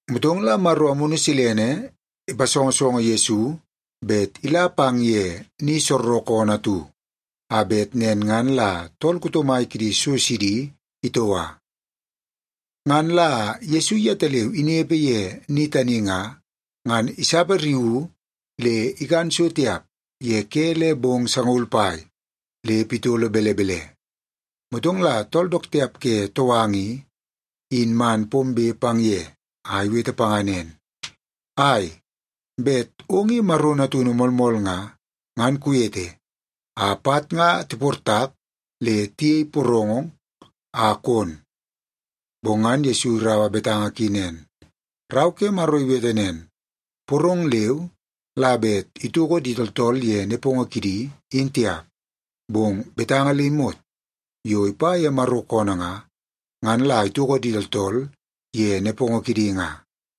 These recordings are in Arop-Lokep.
Motong la Maro Amunu Silene ipasongosongo Yesu bet ila pang ye ni soorookoonoo atu, a bet nen ngan la tool kuto mai kidi so sidi itoua. Ngan la Yesu yetaleu inepe ye ni tani nga, ngan isapariuu le ikan so tiap ye ke le bong sangaul pai le pitolo belebele. Motong la tool dook tiap ke touanga i, in man pombe pang ye a iwete panga nen, “Ai, bet ong i Maro natunu moolmool nga, ngan kuwete a pat nga tiportak le tiyei porong a kon.” Bong ngan Yesu iraua betanga ki nen, “Rau ke Maro iwete nen, ‘Porong leu la bet itoko di tooltool ye nepongo kidi, in tiap, bong betanga le imot yo ipa ye Maro koonoo nga, ngan la itoko di tooltool ye nepongo kidi nga.’”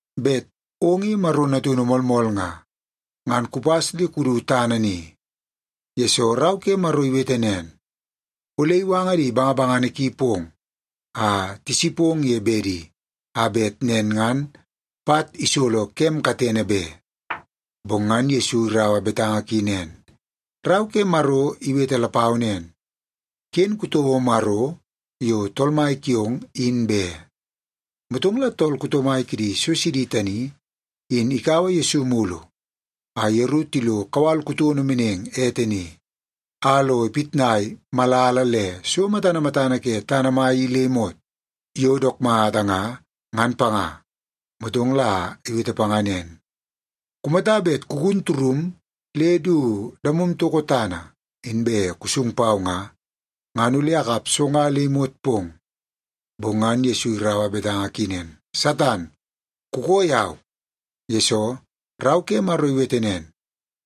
“Bet ong i Maro natunu moolmool nga, ngan kupas le kudu tana ni, yesoo Rau ke Maro iwete nen, ‘Ole iwanga di bangabangana ki pong a tisipong ye bedi, a bet nen ngan pat isolo kem katene be.’” Bong ngan Yesu iraua betanga ki nen, “Rau ke Maro iwete lapau nen, ‘Ken kutouo Maro yo Tool Mai kiong, in be.’” Motong la tool kuto mai kidi so sidi tani in ikaua Yesu mulu a yeru tilo kawal kutono meneng ete ni, a lo ipitnai malala le so matana matana ke tana mai i le imot yo dook mata nga, ngan panga. Motong la iwete panga nen, “Kumata bet kugun turum le du damom toko tana, inbe kusung pau nga, ngan ole akap so nga le imot pong.” Bong ngan Yesu iraua betanga ki nen, “Satan, kukoo yau! Yesoo, Rau ke Maro iwete nen,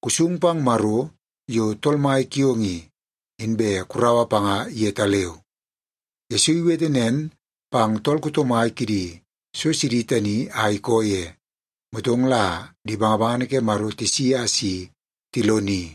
‘Kusung pang Maro yo Tool Mai kiong i, inbe kuraua panga yetaleu.’” Yesu iwete nen pang tool kuto mai kidi so sidi tani a ikoo ye, motong la di bangabangana ke Maro tisi a si tiloni.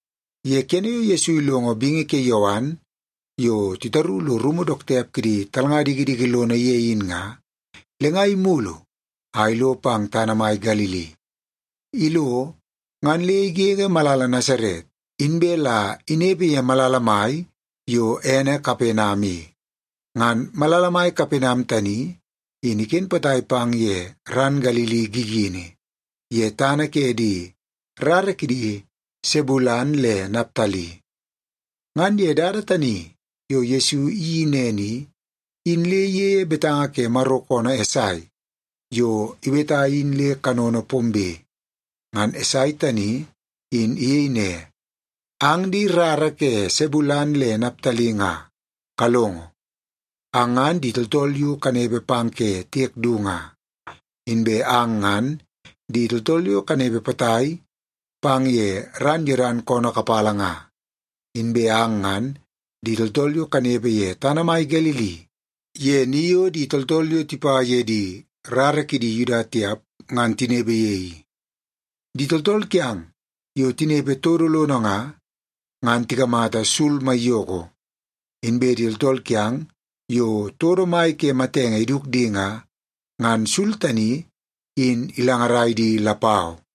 Ye kene yo Yesu ilongo bingi ke Yowan yo titaru lo rumu dook tiap kidi talnga dikidiki lono ye in nga, le nga imulu a ilo pang tana mai Galili. Ilo, ngan le igege malala Nasaret, inbe la inepe ye malala mai yo ene Kapenam i. Ngan malala mai Kapenam tani in iken potai pang ye ran Galili gigini, ye tana ke di rara kidi Sebulen le Naptali. Ngan ye dada tani yo Yesu iyeii nen i, in le iyeie betanga ke Maro koonoo Esai yo iweta in le kanono pombe. Ngan Esai tani in iyei ne, “Ang di rara ke Sebulen le Naptali nga kalongo. Ang ngan di tooltool yo kanepe pang ke tiek du nga, inbe ang ngan di tooltool yo kanepe potai pang ye ran Yodan koonoo kapala nga, inbe ang ngan di tooltool yo kanepe ye tana mai Galili ye ni yo di tooltool yo tipa ye di rara kidi Yuda tiap ngan tinepe ye i. Di tooltool kiang yo tinepe todo lono nga, ngan tikamata sul maiyoko. Inbe di tooltool kiang yo todo mai ke matenge iduk di nga, ngan sul tani in ilangarai di lapau.”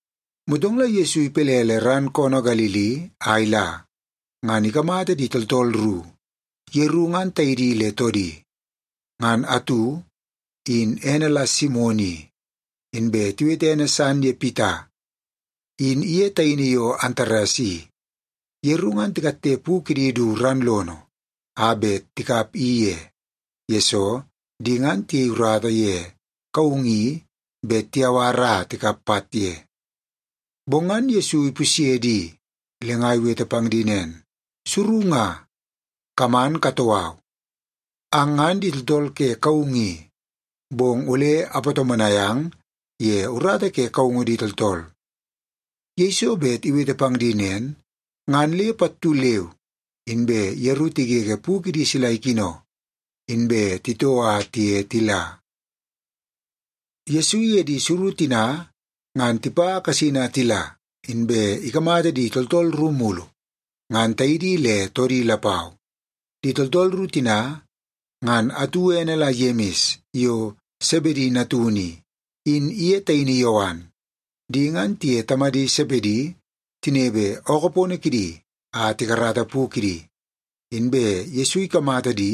Motong la Yesu ipelele ran koonoo Galili a ila, ngan ikamata di tooltool ru, yeru ngan taidi le toodi. Ngan atu, in ene la Simon i, inbe tiwete ene san ye Pita, in iye taini yo Antares i. Yeru ngan tikatte pu kidi du ran lono a bet tikap i ye, yesoo di ngan tiyei urata ye kaungu i bet tiyawar a tikap pat ye. Bong ngan Yesu ipusye di nga, le nga iwete pang di nen, “Suru nga, kaman katoo au. Ang ngan di tooltool ke kaungu i, bong ole apatomonai ang ye urata ke kaungu di tooltool.” Yeiso bet iwete pang di nen, ngan le pattu leu inbe yeru tigege pu kidi sila ikino, inbe titoo a tiye tila. Yesu iye di suru tina ngan tipa kasin a tila, inbe ikamata di tooltool ru mulu, ngan taidi le toodi lapau. Di tooltool ru tina, ngan atu ene la Yemis yo Sebedi natunu i, in iye taini Yowan. Di ngan tiye tamadi Sebedi tinepe ookoo pono kidi a tikarata pu kidi, inbe Yesu ikamata di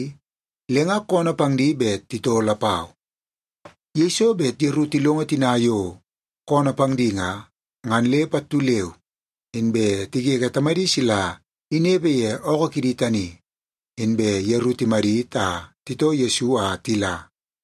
le nga koonoo pang di bet titoo lapau. Yeiso bet yeru tilongo tina yo koonoo pang di nga, ngan le pattu leu inbe tigege tamadi sila inepe ye ookoo kidi tani, inbe yeru timadit a titoo Yesu a tila.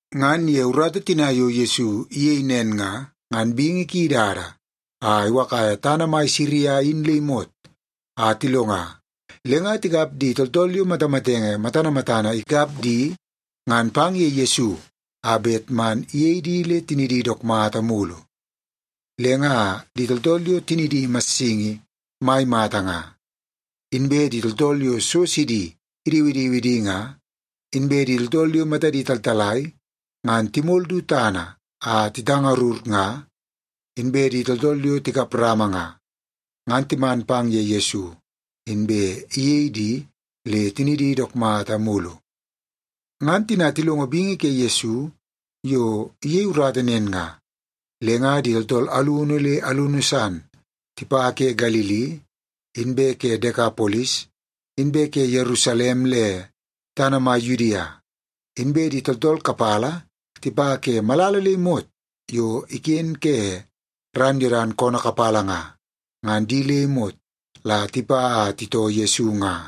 Ngan ye urata tina yo Yesu iyei nen nga, ngan bingi ki idada a iwakaia tana mai Siria in le imot a tilonga, le nga tikap di tooltool yo matamatenge matana matana ikap di ngan pang ye Yesu a bet man iyei di le tinidi dook mata mulu. Le nga di tooltool yo tinidi massingi mai mata nga, inbe di tooltool yo so sidi idiwidiwi di nga, inbe di tooltool yo matadi taltalai ngan timol du tana a titangarur nga, inbe di tooltool yo tikap rama nga, ngan timan pang ye Yesu, inbe iyei di le tinidi dook mata mulu. Ngan tina tilongo bingi ke Yesu yo iyei urata nen nga, le nga di tooltool alunu le alunu san tipa ke Galili, inbe ke Dekapolis, inbe ke Yerusalem le tana mai Yudia, inbe di tooltool kapala tipa ke malala le imot yo iken ke ran Yodan koonoo kapala nga, ngan di le imot la tipa a titoo Yesu nga.